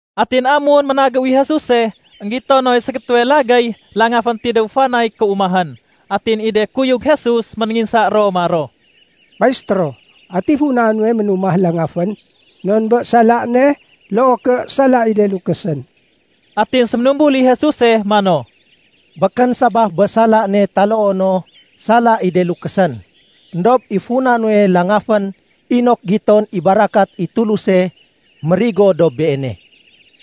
Atin amun ménagéw i Jesuse, énggito noy ségétéwe lagéy langafén tidéw fanay kéumahén. Atin i de kuyug Jesus ménénginsa ro maro, “Maistéro, ati funa nuwe ménumah langafén? Non bé sala ne loo ké sala i de lukésén?” Atin séménumbul i Jesuse mano, “Békén sabaf bé sala ne taloo no sala i de lukésén. Endob i funa nuwe langafén inok giton i barakat i Tuluse mérigo dob beene.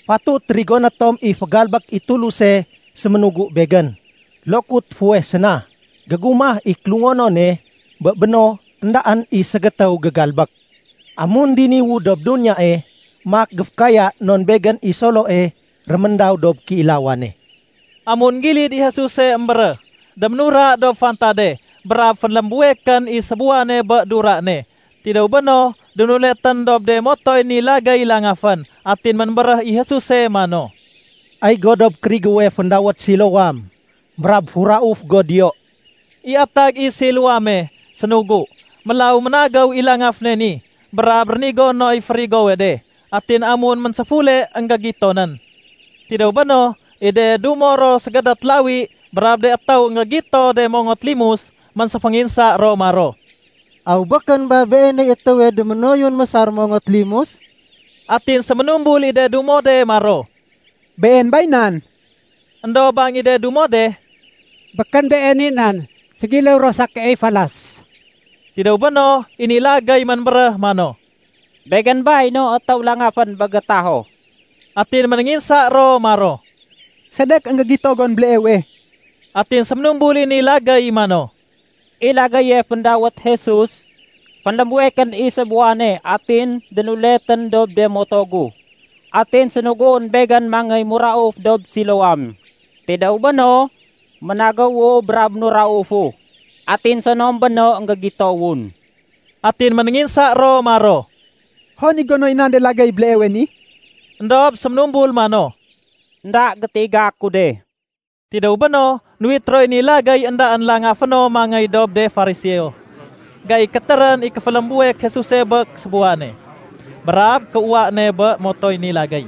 Fatut rigoné tom i fégalbék i Tuluse séménugu Begén, lokut fuweh séna. Gégumah i kélungonone, bé béno éndaén i ségétéw gégalbék. Amun diniwu dob duniyae, maak géfékaya non Begén i Soloe réméndaw dob kéilawane.” Amun énggilid i Jesuse émbéréh, déménura dob fantade brab fénlémbuwekén i sébuwane bé dura ne. Tidéw béno, dénuletén dob de motoy ni lagéy langafén. Atin ménbéréh i Jesuse mano, “Ay go dob kérigéwe féndawét Siloam, brab furauf go diyo.” (I atag i Siloame “sénugu”.) Mélaw ménagéw i langaféne ni brab rénigo noy férigowe de. Atin amun ménséfule, énggégitonén. Tidéw béno, i de dumo ro ségédét lawi brab de étéw énggégito de mongot limus, ménséfénginsa ro maro, “Aw békén ba beeney étéwe déménoyun mésar mongot limus?” Atin séménumbul i de dumo de maro, “Been bay nan.” Endob bang i de dumo de, “Békén been i nan, ségiléw ro sa keey falas.” Tidéw béno, i ni lagéy ménbéréh mano, “Begén bay no étéw langafén bé gétaho.” Atin ménénginsa ro maro, “Sedek énggégito gon béleewe?” Atin séménumbul i ni lagéy mano, “I lagéye féndawét Jesus, fénlémbuwekén i sébuwane atin dénuletén dob de moto gu. Atin sénuguén begén mangéy mérauf dob Siloam. Tidéw béno, ménagéwu brab ménuraufu, atin sonom béno énggégitowun.” Atin ménénginsa ro maro, “Hon i gonoy nan de lagéy béleewe ni?” Endob séménumbul mano, “Enda gétiga ku de.” Tidéw béno, nuwit roy ni lagéy éndaén langaféno mangéy dob de Fariseo. Gai kétérén i kéfélémbuwek Jesuse bé sébuwane brab kéuwa ne bé motoy ni lagéy.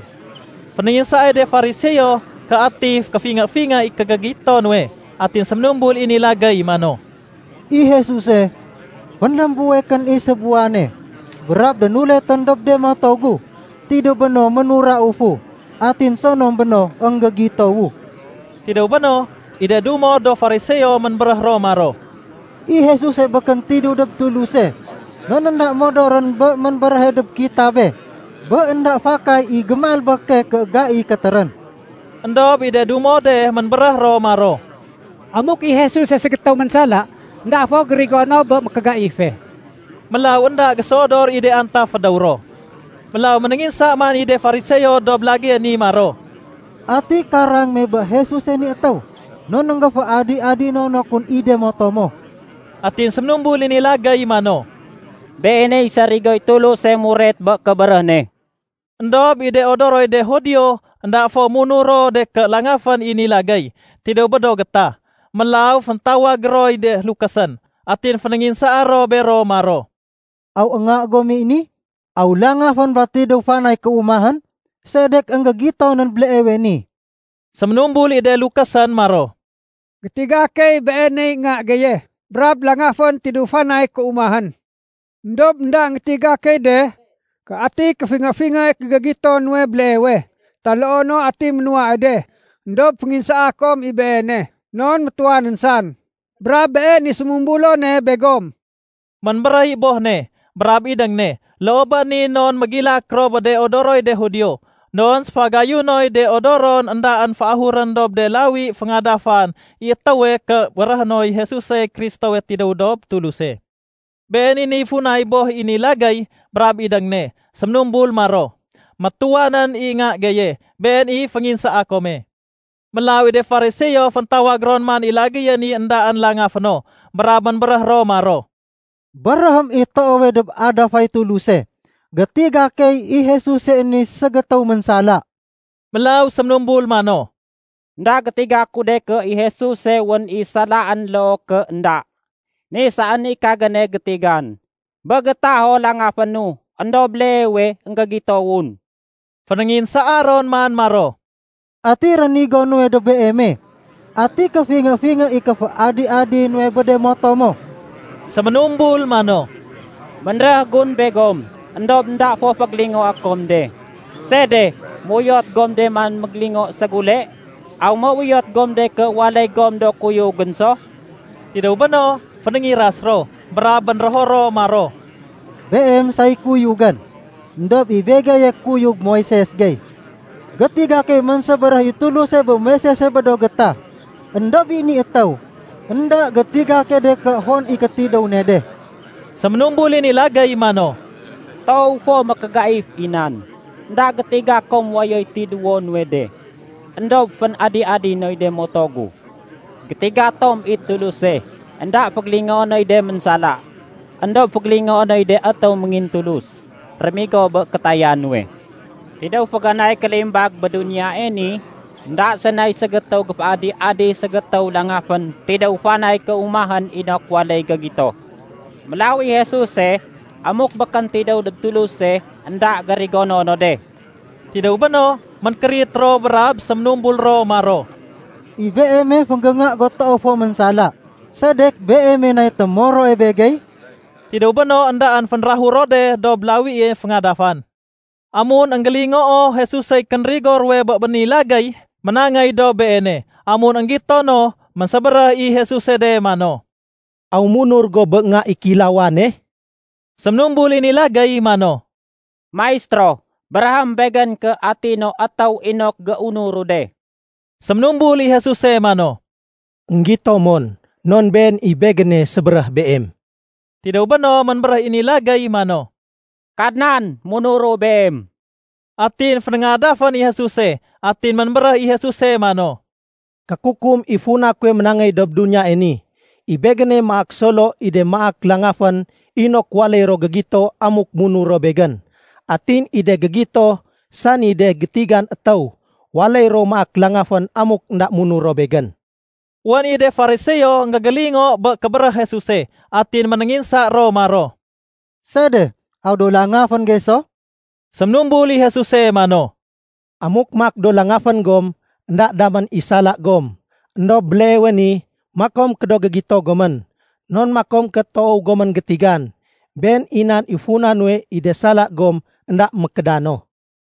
Fénénginsaay de Fariseo ké ati kéfingé-fingé i kégégito nuwe. Atin séménumbul i ni lagéy mano, “I Jesuse, fénlémbuwekén i sébuwane brab dénuletén dob de moto gu. Tidéw béno ménuraufu, atin sonom béno énggégitowu.” Tidéw béno, i de dumo do Fariseo ménbéréh ro maro, “I Jesuse békén tidéw dob Tuluse non énda modorén bé ménbéréhe dob kitabé bé énda fakay i gémalbéke ké gai kétérén.” Endob i de dumo de ménbéréh ro maro, “Amuk i Jesuse ségétéw ménsala, énda fo gérigo no bé mékégaife.” Mélaw énda géséodor i de antaf fédéw ro. Mélaw ménénginsa man i de Fariseo dob lagéye ni maro, “Ati karang me bé Jesuse ni étéw, non énggéféadi-adino no kun i de moto mo?” Atin séménumbul i ni lagéy mano, “Beeney sarigoy Tuluse muret bé kébéréh ne.” Endob i de odoroy de Judio énda fo munur ro de ké langafén i ni lagéy tidéw bé do gétah, mélaw féntawag roy de lukésén. Atin fénénginsaa ro bero maro, “Aw nga gom i ni? Aw langafén ba tidéw fanay kéumahén? Sedek énggégitonén béleewe ni?” Séménumbul i de lukésén maro, “Gétiga key beeney nga geye brab langafén tidéw fanay kéumahén. Endob énda énggétiga key de ké ati kéfingé-fingé i kégégito nuwe béleewe, taloo no ati ménuwae de. Endob fénginsaa kom i beene, non métuwanén san brab been i sémumbulone begom.” Ménbéréh i boh ne brab idéng ne loo bé ni non mégilak ro bé de odoroy de Judio. Non sénfagayunoy de odoron éndaén féahurén dob de lawi féngadafan i étéwe ké béréhé noy Jesusey Kristowe tidéw dob Tuluse. Been i niy funay boh i ni lagéy brab idéng ne séménumbul maro, “Métuwanén i nga geye, been i fénginsaa kome.” Mélaw i de Fariseo féntawag ron man i lagéye ni éndaén langaféno brab ménbéréh ro maro, “Béréhém i toowe dob adafay Tuluse. Gétiga key i Jesuse ni ségétéw ménsala.” Mélaw séménumbul mano, “Enda gétiga ku de ké i Jesuse wén i salaén loo ké énda. Ni saén i kagéne gétigan, bé gétaho langafénu éndob béleewe énggégitowun.” Fénénginsaa ron man maro, “Ati rénigo nuwe dob beeme? Ati kéfingé-fingé i kéféadi-adi nuwe bé de moto mo?” Séménumbul mano, “Bénréh gun begom, éndob énda fo fégélingoé kom de. Sede méuyot gom de man mégélingo ségule? Aw méuyot gom de ké waléy gom do kuyugén so?” Tidéw béno, fénéngiras ro, brab bénrého ro maro, “Beem say kuyugén. Endob i begeye kuyug Moises gey. Gétiga key ménsébéréh i Tuluse bé Moisese bé do gétah. Endob i ni étéw, énda gétiga key de ké hon i kétidéw ne de.” Séménumbul i ni lagéy mano, “Toow fo mékégaif i nan. Enda gétiga kom wayoy tidéwo nuwe de, éndob fén-adi-adi noy de moto gu. Gétiga tom i Tuluse, énda fégélingoé noy de ménsala. Endob fégélingoé noy de étéw méngintulus, rémigo bé kétaya nuwe. Tidéw féganay kélimbag bé duniyae ni énda sénay ségétéw géféadi-adi ségétéw langafén tidéw fanay kéumahén inok waléy gégito. Mélaw i Jesuse, amuk békén tidéw dob Tuluse, énda gérigono no de.” Tidéw béno, ménkérit ro brab séménumbul ro maro, “I beeme fénggénga go toow fo ménsala, sedek beeme nay témoroe begey?” Tidéw béno éndaén, fénrahur ro de dob lawie féngadafan. Amun énggélingoo Jesusey kénrigo ruwe bé ni lagéy, ménangéy dob beene. Amun énggito no, ménsébéréh i Jesuse de mano, “Aw munur go bé Nga i Kéilawane?” Séménumbul i ni lagéy mano, “Maistéro, béréhém begén ké ati no étéw inok géunuru de.” Séménumbul i Jesuse mano, “Enggito mon, non Been i Begéne sébéréh beem.” Tidéw béno, ménbéréh i ni lagéy mano, “Kadnan, munuru Beem.” Atin fénéngadafén i Jesuse. Atin ménbéréh i Jesuse mano, “Kékukum i funa kuwe ménangéy dob duniyae ni. I Begéne maak solo i de maak langafén inok waléy ro gégito amuk munur ro Begén. Atin i de gégito, sani de gétigan étéw, waléy ro maak langafén amuk énda munur ro Begén.” Wén i de Fariseo énggégélingo bé kébéréh Jesuse, atin ménénginsa ro maro, “Sede? Aw do langafén gey so?” Séménumbul i Jesuse mano, “Amuk maak do langafén gom, énda damén i sala gom, éndob béleewe ni makom ké do gégito gomén, non makom ké toow gomén gétigan. Been i nan i funa nuwe i de sala gom énda mékédano.”